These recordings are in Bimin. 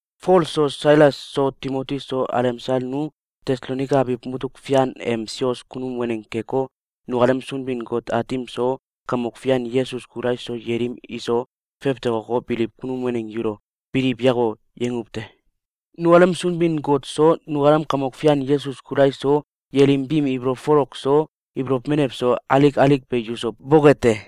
Fol so, Sailas so, Timoti so, alemsal nu Tesalonaika abiw mutuk fian em sios kunum waneng keko, nukalem Sunbin-Got Aatim so, Kamok Fian Yesus Kulais so, yelim iso fewtokoko, biliw kunum waneng yulo “Biliw yako!”, yanguw te. Nukalem Sunbin-Got so, nukalem Kamok Fian Yesus Kulais so, yelim biim ibolow folok so, ibolow menew so, alik alik be yuso boke te!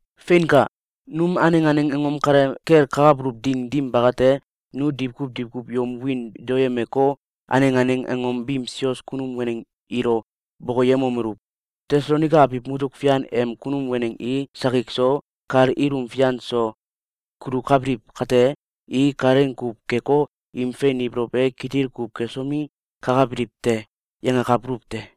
Feinka! Num aneng aneng angom kale kel kakabuluw ding dim bakate, nu diwkuw diwkuw yom wiin daoyemeko, aneng aneng angom biim sios kunum waneng ilo bokoyemomeluw: “Tesalonaika abiw mutuk fian em kunum waneng i sakik so, kal ilum fian so, kulukabiliw kate, i kalaing kuw keko, im fein ibolow e kitil kuw kesomi, kakabiliw te!”, yangakabuluw te.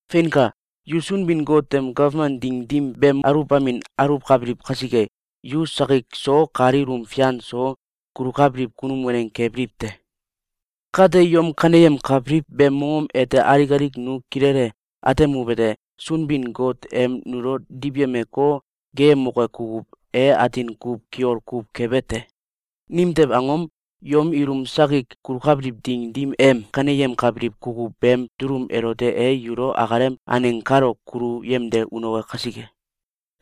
Feinka! Yu Sunbin-Got em gawman ding dim beem aluwbamin aluwkabiliw kasike, yu sakik so kal ilum fian so kulukabiliw kunum waneng kebiliw te. Kate, yom kaneyemkabiliw beem mongom ete alik alik nu kilele atemuwete: Sunbin-Got em nulo diwyemeko, geeyemoke kukuw e atin kuw kiol kuw kebe te. Nimtew angom? Yom ilum sakik kulukabiliw ding dim em kaneyemkabiliw kukuw beem dulum elote e yulo akalem aneng kalo kulu yemde unoke kasike.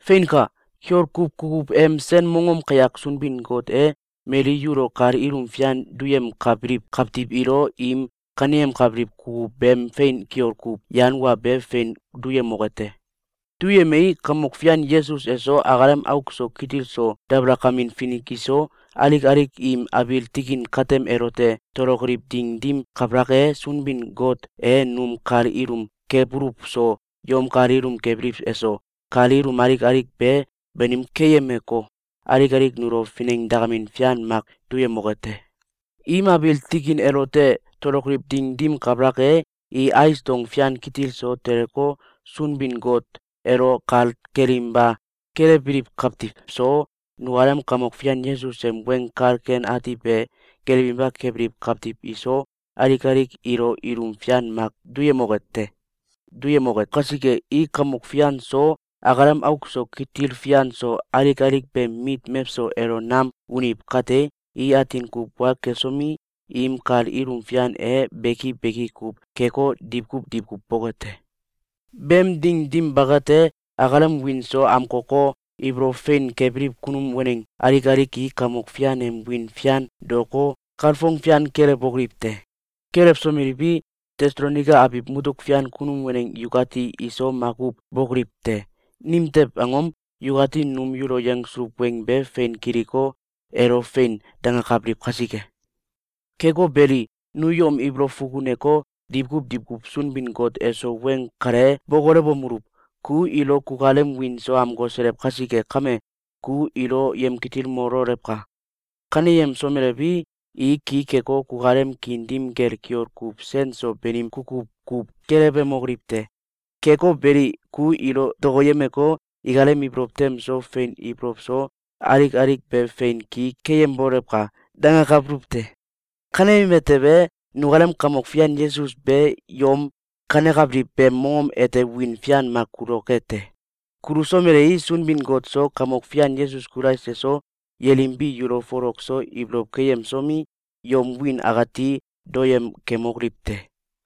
Feinka! Kiol kuw kukuw em sen mongom kayak Sunbin-Got e mali yulo kal ilum fian duyemkabiliw kawtiw ilo im kaneyemkabiliw kukuw beem fein kiol kuw yan wa be fein duyemoke te. Duyemei, Kamok Fian Yesus eso, akalem auk so kitil so dabalakamin finik iso, alik alik im abiil tikin katem elote tolokoliw ding dim kabalak e, Sunbin-Got e num kal ilum kebuluw so, yom kal ilum kebiliw eso, kal ilum alik alik be banim keyemeko, alik alik nulo finengdakamin fian mak duyemoke te. Im abiil tikin elote tolokoliw ding dim kabalak e, i ais dong fian kitil so teleko, Sunbin-Got elo kal kelinba kelewbiliw kawtiw so, nukalem Kamok Fian Yesus em Weng Kal Ken Ati be gelewinba kebiliw kawtiw iso, alik alik ilo ilum fian mak duyemoke te. Duyemoke kasike, i Kamok Fian so, akalem auk so kitil fian so, alik alik beem mit mewso elo nam uniw kate, i atin kuw wa kesomi, im kal ilum fian e beki beki kuw keko, diwkuw diwkuw boke te. Beem ding dim bakate, akalem wiin so amkoko, ibolow fein kebiliw kunum waneng alik alik i Kamok Fian em wiin fian daoko, kalfong fian kelewbokoliw te. Kelewsomeliwi, Tesalonaika abiw mutuk fian kunum waneng yukati iso makuw bokoliw te! Nimtew angom? Yukati num yulo yangsuluw weng be fein kiliko, elo “Fein!”, dangakabiliw kasike. Keko beli, nu yom ibolow fukuneko, diwkuw diwkuw Sunbin-Got eso weng kale bokolewomeluw: “Ku ilo kukalem wiin so amkoselew kasike kame, ku ilo yemkitilmololewka! Kaneyemsomelewi, i ki keko, kukalem kiin dim kel kiol kuw sen so banim kukuw kuw gelewemokoliw te. Keko beli, ku ilo dokoyemeko, ikalem ibolow tem so, fein ibolow so, alik alik be fein ki keyembolewka!”, dangakabuluw te. Kaneyeme tewe, nukalem Kamok Fian Yesus be yom kanekabiliw beem mongom ete wiin fian mak kuloke te. Kulusomelei, Sunbin-Got so, Kamok Fian Yesus Kulais eso, yelim bi yulo folok so ibolow keyemsomi, yom wiin akati daoyem kemokoliw te.